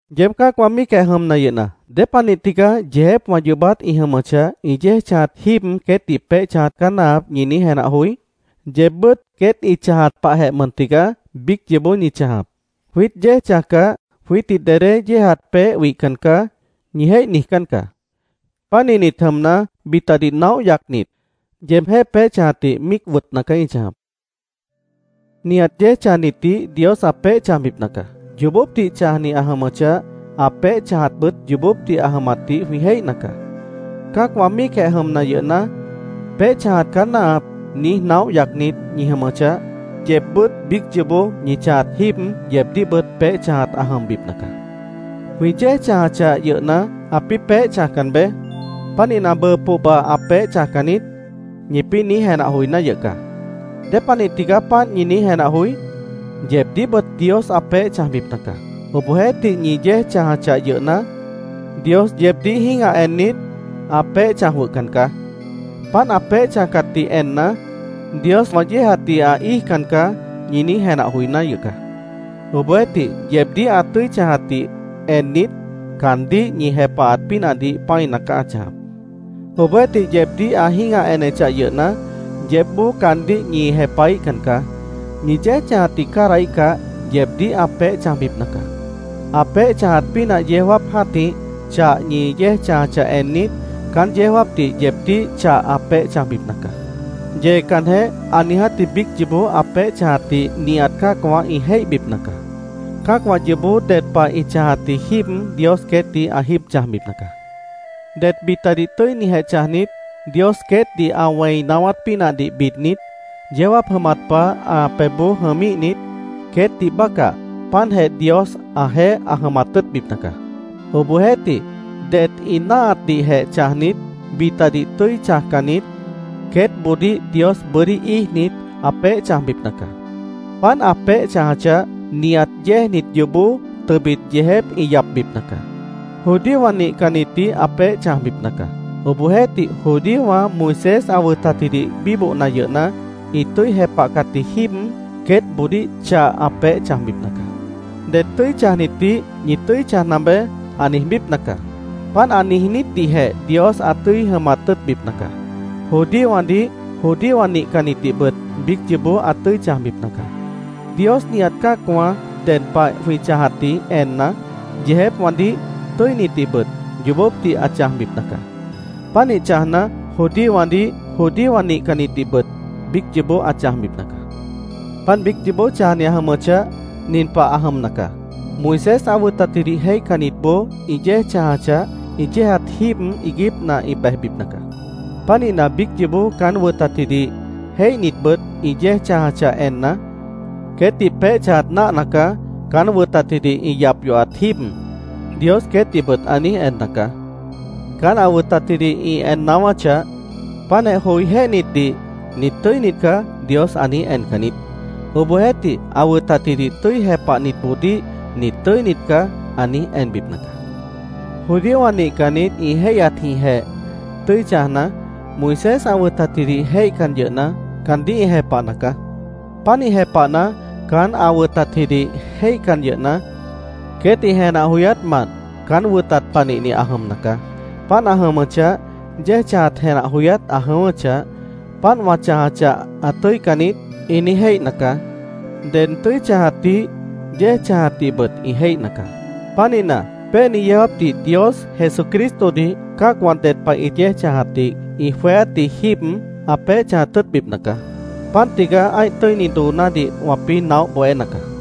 Yeéb cã́acwã míicjeh jʉmna yʉhna, ¿Dépanih tigaá “Yeejépwã yoobát ĩ jʉmʉchah, ĩ yéej chãjat jíib, queétdih peéh chãjat caá náahap”, ñi niíj jenah joí? Yeebbʉ́t queét ĩ chãjat pahjeh mʉn tigaá biíc yoobó ñi chãjap. “Jwiít yéej chãjcah, jwiítdih dedé yéejat peéh wihcan caá”, ñi jéih niijcán caá. Pánihnit jʉmna, bitadih naóh yacnit, yeebjéh peéh chãjatdih míic wʉtna caá ñi chãjap. Nihat yéej chãjnitdih Dios ã peéh chãjbipna caá. Yoobópdih chãjni ã jʉmʉchah, ã peéh chãjatbʉt yoobópdih ã jʉmatdih jwĩ jéihna caá. Cã́acwã míicjeh jʉmna yʉhna, “Peéh chãjat caá náahap”, niíj naóh yacnit ñi jʉmʉchah, yeebbʉ́t biíc yoobó ñi chãjat jíib, yeebdíhbʉt peéh chãjat ã jʉmbipna caá. “Jwĩ yéej chãjachah yʉhna, ãpĩ́ peéh chãjcan beé. Pánihna, bʉʉ pohba, ã peéh chãjcan niít”, ñipĩ́ niíj jenah joiná yʉh caá. ¿Dépanih tigaá páant ñi niíj jenah joí? Yeebdíhbʉt Dios ã peéh chãjbipna caá. Obohjeéhtih, ñi yéej chãjachah yʉhna, Dios yeebdíh jĩ́gah ennit, ã peéh chãj jwʉhcan caá. Páant ã peéh chãjcatdih enna, “Dios wã yéejatdih ã íijcan caá”, ñi niíj jenah joiná yʉh caá. Obohjeéhtih, yeebdíh ã tʉ́i chãjatdih ennit, caandíh ñi jepahat pínahdih pã́ina caá ã chãjap. Obohjeéhtih, yeebdíh ã jĩ́gah enechah yʉhna, yeébboó caandíh ñi jepahíhcan caá. Ñi yéej chãjatdih cádahíhcah, yeebdíh ã peéh chãjbipna caá. Ã peéh chãjat pínah yeó jáap jã́tih, chah ñi yéej chãjachah ennit, caán yeó jáapdih yeebdíh chah ã peéh chãjbipna caá. Yeecanjeh, ã niijátji biíc yoobó ã peéh chãjatdih nihat cã́acwã ĩ jéihbipna caá. Cã́acwã yoobó ded pah ĩ chãjatji jíib Dios queétdih ã jíib chãjbipna caá. Det bitadih tʉ́inijeh chãjnit, Dios queétdih ã wẽi naáwát pínahdih bidnit, yeó jáap jʉmat pah ã pebhboó jʉmíhnit, queétdih bácah páantjeh Dios ãjeéh ã jʉmat tʉ́ʉtbipna caá. Obohjeéhtih, det ĩ náahatdihjeh chãjnit, bitadih tʉ́i chãjcannit, queétboodíh Dios bʉ́dí íijnit, ã peéh chãjbipna caá. Páant ã peéh chãjachah, nihat yéejnit yoobó tʉbit yeejép ĩ yapbipna caá. Judíowã nihcannitdih ã peéh chãjbipna caá. Obohjeéhtih, judíowã Moisés ã wʉtatjidih bíbohna yʉhna, ĩ tʉ́i jepahcatji jíib queétboodíh chah ã peéh chãjbipna caá. Det tʉ́i chãjnitdih, “Ñi tʉ́i chãjna beé”, ã niijbípna caá. Páant ã niijnítdihjeh Dios ã tʉ́i jʉmat tʉ́ʉtbipna caá. Judíowãdih, judíowã nihcannitdihbʉt biíc yoobó ã tʉ́i chãjbipna caá. Dios nihat cã́acwã ded pah jwĩ chãjatdih enna, yeejépwãdih, tʉ́initdihbʉt yoobópdih ã chãjbipna caá. Pánih chãjna, judíowãdih, judíowã nihcannitdihbʉt biíc yoobó ã chãjbipna caá. Páant biíc yoobó chãjni ã jʉmʉchah, nin pah ã jʉmna caá: Moisés ã wʉtatjidih jéihcannitboó ĩ yéej chãjachah, ĩ yéejat jíib iiguípna ĩ bejbipna caá. Pánihna, biíc yoobó caán wʉtatjidih jéihnitbʉt ĩ yéej chãjachah enna, “Queétdih peéh chãjat náahna caá, caán wʉtatjidih ĩ yap yohat jíib”, Dios queétdihbʉt ã niíj enna caá. Caán ã wʉtatjidih ĩ en naáwáchah, páantjeh joijéhnitdih “Nit tʉ́init caá”, Dios ã niíj encan niít. Obohjeéhtih, ã wʉtatjidih tʉ́i jepahnitboodíh “Nit tʉ́init caá”, ã niíj enbipna caá. Judíowã nihcannit ĩ jéihyatjĩhjeh tʉ́i chãjna, Moisés ã wʉtatjidih jéihcan yʉhna, caandíh ĩ jepahna caá. Pánih jepahna, caán ã wʉtatjidih jéihcan yʉhna, queét ĩ jenah joyátmant caán wʉtat panihni ã jʉmna caá. Páant ã jʉmʉchah, yéej chãjat jenah joyát ã jʉ̃ʉ́wʉ́chah, “Páant wã chãjachah, ã tʉ́ican niít”, ĩ niíj jéihna caá. Ded tʉ́i chãjatdih, yéej chãjatdihbʉt ĩ jéihna caá. Pánihna, péeni yeó jáapdih Dios Jesucristodih cã́acwã ded pah ĩ yéej chãjatdih ĩ jweéátji jíib ã peéh chãjat tʉ́ʉtbipna caá. Páant tigaá ã́ih tʉ́ini doonádih wãpĩ́ naóh bohéna caá.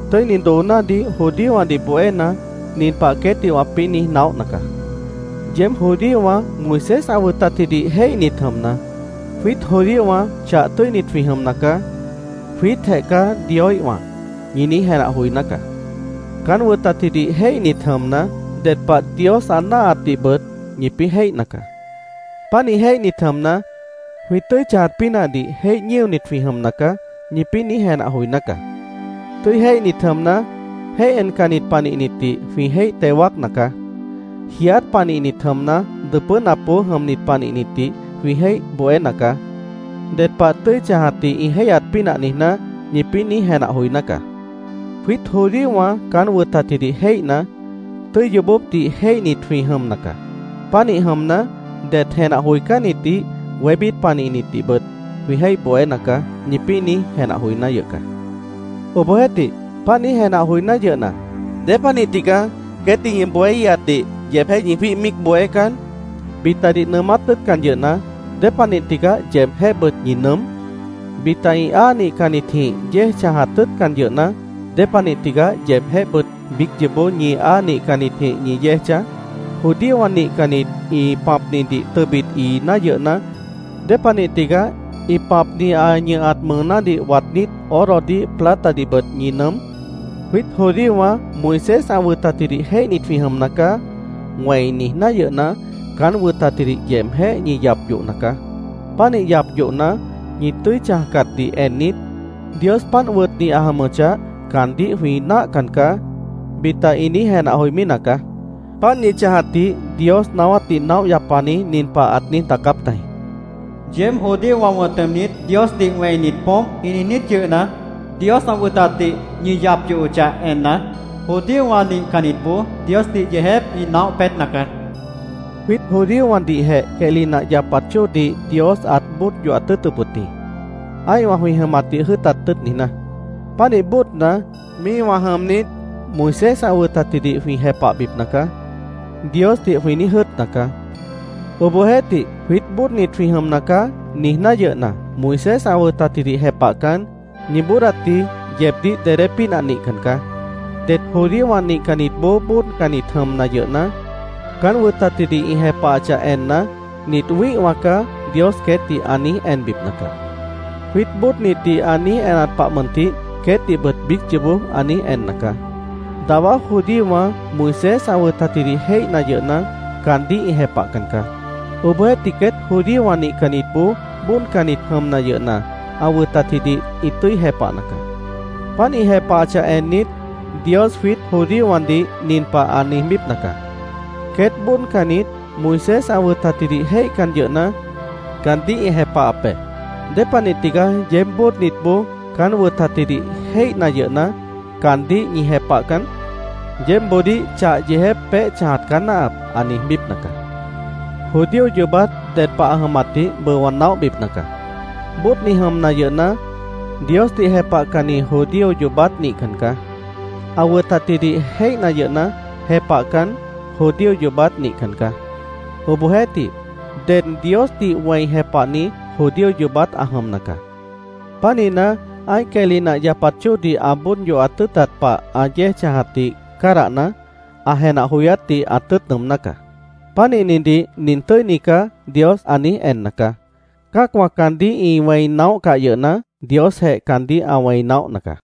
Tʉ́ini doonádih judíowãdih bohéna, nin pah queétdih wãpĩ́ niíj naóhna caá: Yeéb judíowã, Moisés ã wʉtatjidih jéihnit jʉmna, “Jwiít judíowã chah tʉ́init jwĩ jʉmna caá. Jwiítjeh caá Dioíhwã”, ñi niíj jenah joiná caá. Caán wʉtatjidih jéihnit jʉmna, ded pah Dios ã náahatdihbʉt ñipĩ́ jéihna caá. Pánih jéihnit jʉmna, “Jwĩ tʉ́i chãjat pínahdih jéih ñíonit jwĩ jʉmna caá”, ñipĩ́ niíj jenah joiná caá. “Tʉ́i jéihnit jʉmna, jéih encannit panihnitdih jwĩ jéih teo wáacna caá. Jiiát panihnit jʉmna, dʉpʉ́napboó jʉmnit panihnitdih jwĩ jéih bohéna caá, ded pah tʉ́i chãjatdih ĩ jéihyat pínah niijná”, ñipĩ́ niíj jenah joiná caá. “Jwiít judíowã caán wʉtatjidih jéihna, tʉ́i yoobópdih jéihnit jwĩ jʉmna caá. Pánih jʉmna, det jenah joicánnitdih, wébít panihnitdihbʉt jwĩ jéih bohéna caá”, ñipĩ́ niíj jenah joiná yʉh caá. Obohjeéhtih, páant niíj jenah joiná yʉhna, ¿dépanih tigaá queétdih ñi bohéíhatdih yeebjéh ñi jwíih míic bohécan? Bitadih nʉʉmát tʉ́ʉtcan yʉhna, ¿dépanih tigaá yeebjéhbʉt ñi nʉʉ́m? Bita ĩ áa nihcannitjĩh yéej chãjat tʉ́ʉtcan yʉhna, ¿dépanih tigaá yeebjéhbʉt biíc yoobó ñi áa nihcannitjĩh ñi yéej chãj? Judíowã nihcannit ĩ pãpnidih tʉbit iiná yʉhna, ¿dépanih tigaá ĩ pãpni ã ñʉhat mʉʉnádih waadnít, orodih platadihbʉt ñi nʉʉ́m? “Jwiít judíowã Moisés ã wʉtatjidih jéihnit jwĩ jʉmna caá”, wẽi niijná yʉhna, caán wʉtatjidih yeebjéh ñi yap yohna caá. Pánih yap yohna, ñi tʉ́i chãjcatdih ennit, “Dios páant wʉtni ã jʉmʉchah, caandíh jwĩ náahcan caá”, bita ĩ niíj jenah joimí nacaá. Páant ñi chãjatdih Dios naáwátdih naóh yapani nin pah ãt niíj daacáp tajĩ: “Yeéb judíowã wʉ̃t jʉmnit, ‘Diosdih wẽinit poómp’, ĩ niijnít yʉhna, Dios ã wʉtatdih ñi yap yohochah enna, judíowã nihcannitboó Diosdih yeejép ĩ naóh peétna caá”, ãt niíj daacáp tajĩ. Jwiít judíowãdihjeh quehli nah yapat chóodih Dios ãt bóod yohat tʉ́ʉtʉp wʉt jĩ, ã́ihwã jwĩ jʉmatdih jʉ́ʉtat tʉ́ʉt niijná. Pánih bóodna, “Míihwã jʉmnit, Moisés ã wʉtatjidih jwĩ jepahbipna caá”, Diosdih jwĩ niíj jʉ́ʉtna caá. Obohjeéhtih, “Jwiít bóodnit jwĩ jʉmna caá”, niijná yʉhna, Moisés ã wʉtatjidih jepahcan, ñi bóodatji yeebdíh dedé pínah nihcan caá. Det judíowã nihcannitboó bóodcannit jʉmna yʉhna, caán wʉtatjidih ĩ jepahachah enna, “Nit wĩ́ihwã caá”, Dios queétdih ã niíj enbipna caá. Jwiít bóodnitdih ã niíj enat pah mʉntih, queétdihbʉt biíc yoobó ã niíj enna caá. Dawá judíowã Moisés ã wʉtatjidih jéihna yʉhna, caandíh ĩ jepahcan caá. Obohjeéhtih, queét judíowã nihcannitboó bóodcannit jʉmna yʉhna, ã wʉtatjidih ĩ tʉ́i jepahna caá. Páant ĩ jepahachah ennit, Dios jwiít judíowãdih nin pah ã niijbípna caá: “Queét bóodcannit, Moisés ã wʉtatjidih jéihcan yʉhna, caandíh ĩ jepahap be. ¿Dépanih tigaá yeéb bóodnitboó caán wʉtatjidih jéihna yʉhna, caandíh ñi jepahcan? Yeébboodíh chah yeejép peéh chãjat caá náahap”, ã niijbípna caá. Judío yoobát ded pah ã jʉmatdih bʉʉ wã naóhbipna caá. Bóodni jʉmna yʉhna, Diosdih jepahcanni judío yoobát nihcan caá. Ã wʉtatjidih jéihna yʉhna, jepahcan, judío yoobát nihcan caá. Obohjeéhtih, ded Diosdih wẽi jepahni judío yoobát ã jʉmna caá. Pánihna, ã́ih quehli nah yapat chóodih ã bóod yohat tʉ́ʉtat pah ã yéej chãjatdih cádahna, ã jenah joyátdih ã tʉ́ʉt nʉʉmná caá. Pánihnidih “Nin tʉ́ini caá”, Dios ã niíj enna caá. Cã́acwã caandíh ĩ wẽi naóhcah yʉhna, Diosjeh caandíh ã wẽi naóhna caá.